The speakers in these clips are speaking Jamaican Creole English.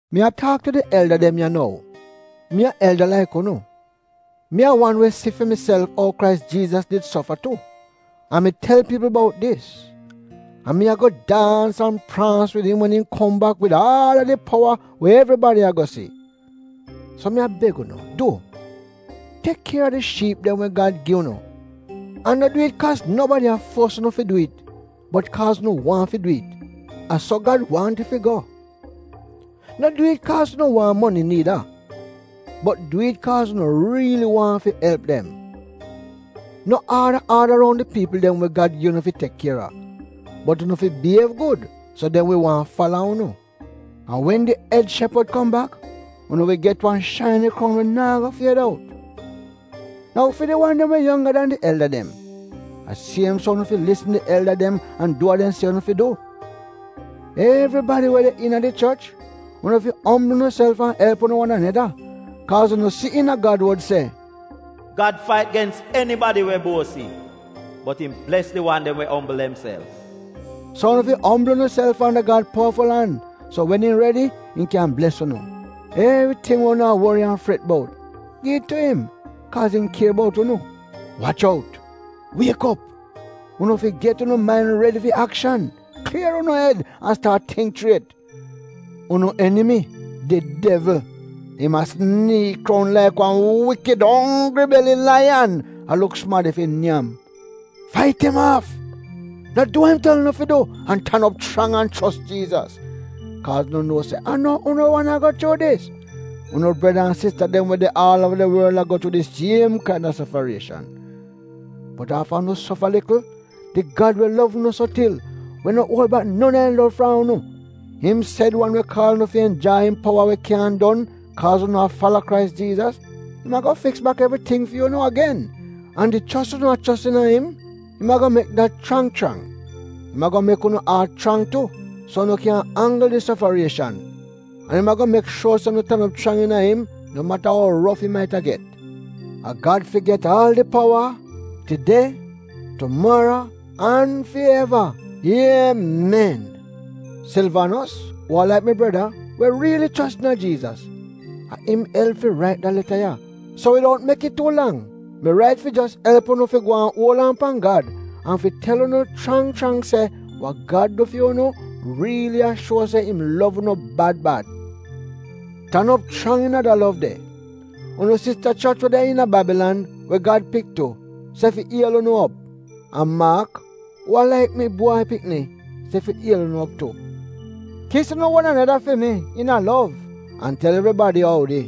Mi a taak tu di elda dem ya nou. Mi a elda laik unu, mi a wan we si fi miself ou Krais Jiizas did sofa tu, an mi tel piipl bout dis, an mi ago daans an praans wid im wen im kom bak wid aal a di powa we evribadi ago si. So mi a beg unu du, tek kier a di shiip dem we Gad gi unu, an no du it kaaz nobadi a fuos unu fi du it bot kaaz unu waahn fi du it. A so Gad waahn it fi go. No du it kaaz unu waahn moni niida bot du it kaaz unu riili waahn fi elp dem. No aada-aada roun di piipl dem we Gad gi unu fi tek kier a. Bot unu fi biyiev gud so dem wi waahn fala unu. An wen di Ed Shepad kom bak, unu wi get wan shaini kroun we naa go fied out. Nou fi di wan dem we yongga dan di elda dem, a siem so unu fi lisn di elda dem an du wa dem se unu fi du. Evribadi we de iina di choch, unu fi ombl unuself an elp unu wan aneda, kaaz unu si iina Gad wod se, “Gad fait gens enibadi we buosi, bot im bles di wan dem we ombl demself.” So unu fi ombl unuself anda Gad powaful an, so wen im redi im kyan bles unu. Evriting we unu a wori an fret bout, gi it tu im, kaaz im kier bout unu. Wach out! Wiek op. Unu fi get unu main redi fi akshan. Klier unu ed an staat tingk chriet. Unu enimi — di devl, im a siniik roun laik wan wikid onggri-beli laiyan, a luk sumadi fi nyam. Fait im aaf. No du wa im tel unu fi du, an tan op chrang an chos Jiizas, kaaz unu nuo se a no unu wan a go chuu dis, unu breda an sista dem we de aal uova di worl a go chuu di siem kaina sofarieshan. Bot afta unu sofa likl, di Gad we lov unu so til, we no uol bak non a im lov fram unu, im sed wan we kaal unu fi enjai im powa we kyaahn don, kaaz unu a fala Krais Jiizas — im ago fiks bak evriting fi unu agen, an di chos unu chos iina im, im ago mek dat get chrang chrang. Im ago mek unu aat chrang tu, so unu kyan anggl di sofarieshan. An im ago mek shuor se unu tan op chrang iina im no mata ou rof it maita get. A Gad fi get aal a di powa, tide, tumaro an fi eva! Iemen. Silvanos, uu a laik mi breda, we riili chos iina Jiizas, a im elp fi rait da leta ya, so widout no mek it tuu lang, mi rait fi jos elp unu fi gwaan uol aan pan Gad, an fi tel unu chrang chrang se wa Gad du fi unu riili a shuo se im lov unu bad bad. Tan op chrang iina da lov de. Unu sista choch we de iina Babilan, we Gad pik tu, se fi iel unu op, an Maak, uu a laik mi bwai pikni, se fi iel unu op tu. Kis unu wan aneda fi mi, iina lov, an tel evribadi oudi.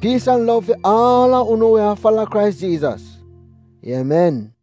Piis an lov fi aal a unu we a fala Krais Jiizas. Iemen.